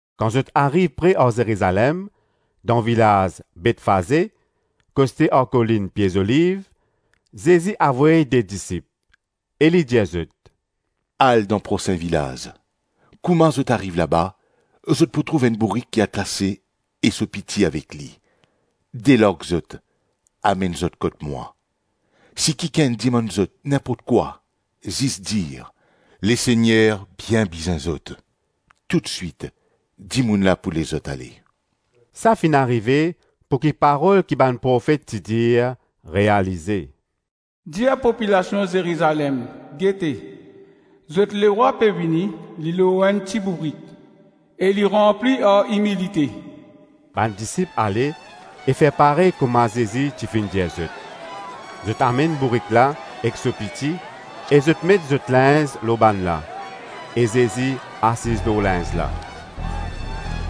Kan zot ariv pre ar Zerizalem, dan vilaz Betfaze, koste ar kolinn Pie Zoliv, Zezi avoy de disip, e li dir zot, “Al dan prosin vilaz; kouma zot ariv laba, zot pou trouv enn bourik ki atase e so piti avek li. Delarg zot, amenn zot kot mwa. Si kikenn dimann zot ninport kwa, zis dir, ‘Lesegner bien bizin zot.’ Toutswit, dimoun la pou les zot ale.” Sa finn arive pouki parol ki bann Profet ti dir realize: “Dir popilasion Zerizalem: gete, zot lerwa pe vini li lor enn ti bourik, e li ranpli ar imilite.” Bann disip ale e fer parey kouma Zezi ti finn dir zot; zot amenn bourik la ek so piti, e zot met zot linz lor bann la e Zezi asiz lor linz la.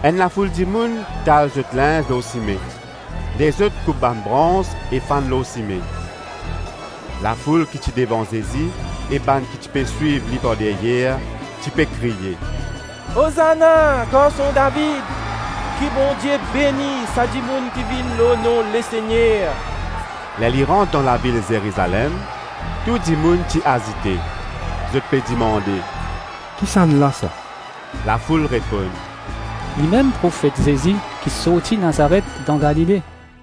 Enn lafoul dimoun tal zot linz lor sime, lezot koup bann brans e fann lor sime. Lafoul ki ti devan Zezi e bann ki ti pe swiv li par deryer, ti pe kriye; “Ozana garson David! Ki Bondie beni sa dimoun ki vinn lor nom Lesegner!” Ler li rant dan lavil Zerizalem, tou dimoun ti azite, zot pe dimande, “Kisannla sa?” Lafoul reponn, “Limem profet Zezi ki sorti Nazaret dan Galile.”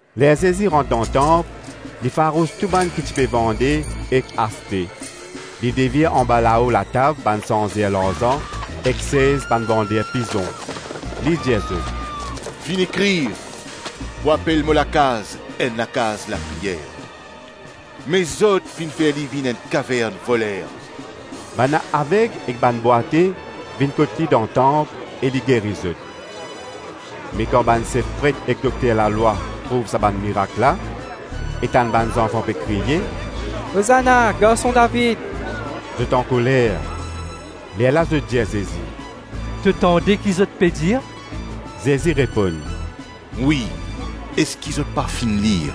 Ler Zezi rant dan tanp, li farous tou bann ki ti pe vande ek aste, li devir anba lao latab bann sanzer larzan ek sez bann vander pizon. Li dir zot, “Finn ekrir, ‘Pou apel mo lakaz, enn lakaz lapriyer.’ Me zot finn fer li vinn enn kavern voler.” Bann aveg ek bann bwate vinn kot li dan tanp, e li geri zot. Me kan bann sef pret ek dokter lalwa trouv sa bann mirak la e tann bann zanfan pe kriye, ‘Ozana Garson David,’ zot ankoler. Lerla zot dir Zezi, “To tande ki zot pe dir?” Zezi reponn, “Wi. Eski zot pa finn lir: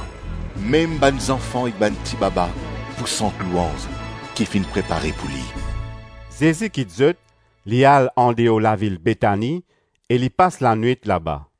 ‘Mem bann zanfan ek bann ti baba pou sant louanz ki finn prepare pou li.’” Zezi kit zot, li al andeor lavil Betani, e li pas lanwit laba.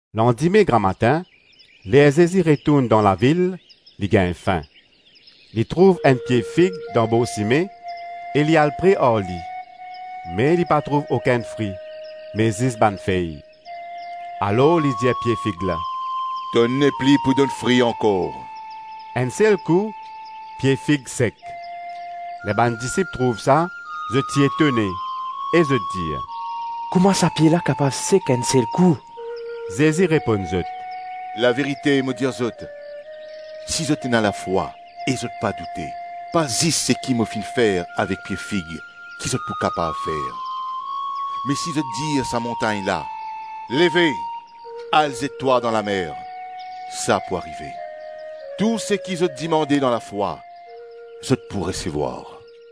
Landime gramatin, ler Zezi retourn dan lavil, li gagn fin. Li trouv enn pie fig dan bor sime e li al pre ar li, me li pa trouv okenn fri, me zis bann fey. Alor li dir pie fig la: “To nepli pou donn fri ankor” Enn sel kou pie fig sek. Ler bann disip trouv sa, zot ti etone, e zot dir: “Kouma sa pie la kapav sek enn sel kou?” Zezi reponn zot, “Laverite, mo dir zot, si zot ena lafwa e zot pa doute, pa zis seki mo finn fer avek pie fig ki zot pou kapav fer; me si zot dir sa montagn la, ‘leve al zet twa dan lamer,’ sa pou arive. Tou seki zot dimande dan lafwa, zot pou resevwar.”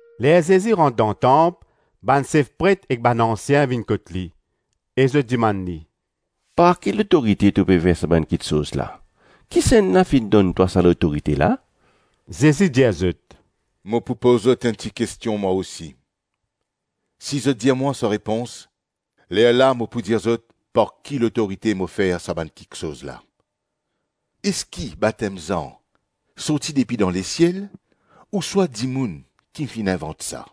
Ler Zezi rant dan tanp, bann sef pret ek bann ansien vinn kot li, e zot dimann li, “Par ki lotorite to pe fer sa bann kiksoz la, kisannla finn donn twa sa lotorite la?” Zezi dir zot, “Mo pou poz zot enn ti kestion mwa osi; si zot dir mwa so repons, lerla mo pou dir zot par ki lotorite mo fer sa bann kiksoz la. Eski batem Zan sorti depi dan lesiel ouswa dimoun ki finn invant sa?”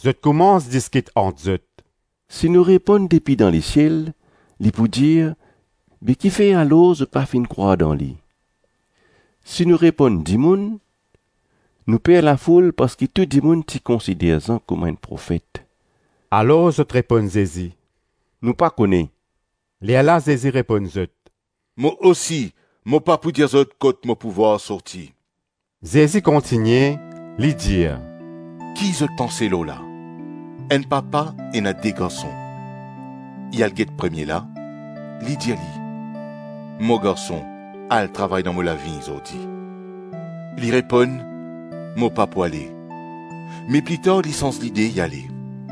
Zot koumans diskit ant zot, “Si nou reponn ‘depi dan lesiel’, li pou dir, be kifer alor zot pa finn krwar dan li? Si nou reponn, ‘Dimoun,’ nou per lafoul parski tou dimoun ti konsider Zan kouma enn profet.” Alor zot reponn Zezi, “Nou pa kone.” Lerla Zezi reponn zot, “Mo osi mo pa pou dir zot kot mo pouvwar sorti.” Zezi kontigne, li dir “Ki zot panse lor la? Enn papa ena de garson. Li al get premie la, li dir li, ‘Mo garson, al travay dan mo lavign zordi.’ Li reponn, ‘Mo pa pou ale.’ Me plitar li sanz lide li ale.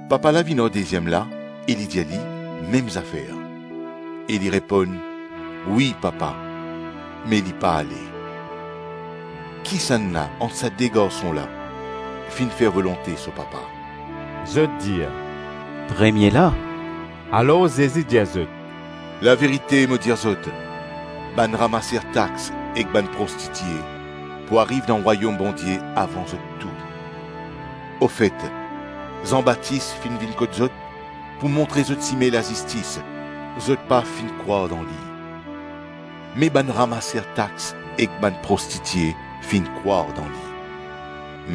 Papa la vinn ar deziem la e li dir li mem zafer; e li reponn ‘Wi papa,’ me li pa ale. Kisannla ant sa de garson la finn fer volonte so papa?” Zot dir, “Premie la.” Alor Zezi dir zot, “Laverite, mo dir zot, bann ramaser tax ek bann prostitie pou ariv dan Rwayom Bondie avan zot tou. Ofet, Zan Batis finn vinn kot zot pou montre zot sime lazistis zot pa finn krwar dan li, me bann ramaser tax ek bann prostitie finn krwar dan li.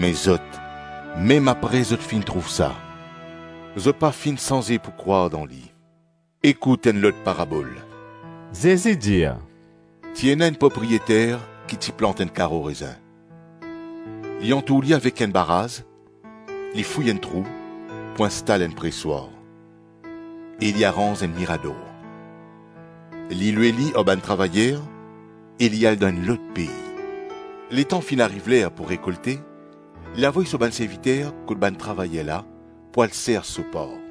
Me zot, mem apre zot finn trouv sa, zot pa finn sanze pou krwar dan li.” “Ekout enn lot parabol,” Zezi dir, “Ti ena enn propriyeter ki ti plant enn karo rezin, li antour li avek enn baraz, li fouy enn trou pou instal enn preswar, e li aranz enn mirador. Li lwe li ar bann travayer e li al dan enn lot pei. Letan finn ariv ler pou rekolte, li avoy so bann serviter kot bann travayer la pou al sers so par.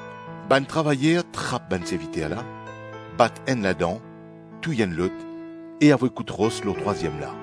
Bann travayer trap bann serviter la, bat enn ladan, touy enn lot e avoy kout ros lor trwaziem la.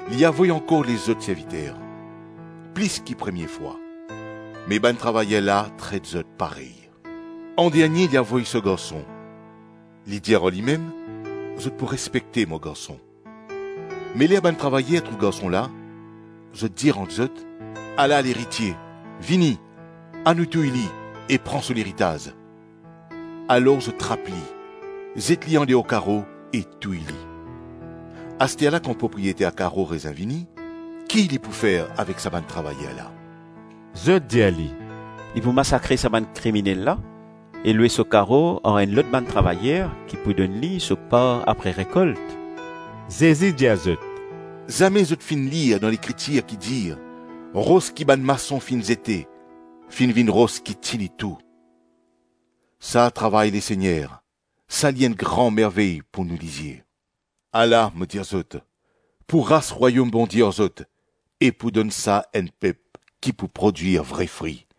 Li avoy ankor lezot serviter, plis ki premie fwa, me bann travayer la tret zot parey. Andernie li avoy so garson. Li dir ar limem, ‘Zot pou respekte mo garson.’ Me ler bann travayer trouv garson la, zot dir ant zot, ‘Ala leritie; vini, anou touy li e pran so leritaz.’ Alor zot trap li, zet li andeor karo e touy li. Asterla kan propriyeter karo rezin vini, ki li pou fer avek sa bann travayer la?” Zot dir li, “Li pou masakre sa bann kriminel la e lwe so karo ar enn lot bann travayer ki pou donn li so par apre rekolt.” Zezi dir zot, “Zame zot finn lir dan Lekritir ki dir: ‘Ros ki bann mason finn zete finn vinn ros ki tini tou, Sa travay Lesegner, Sa li enn gran mervey pou nou lizie. Ala, mo dir zot, pou ras Rwayom Bondie ar zot e pou donn sa enn pep ki pou prodwir vre fri.” [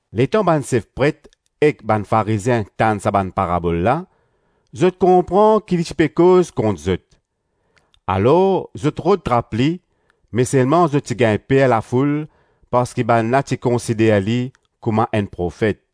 Letan bann sef pret ek bann Farizien tann sa bann parabol la, zot konpran ki li ti pe koz kont zot. Alor zot rod trap li me selman zot ti gagn per lafoul parski bann la ti konsider li kouma enn profet.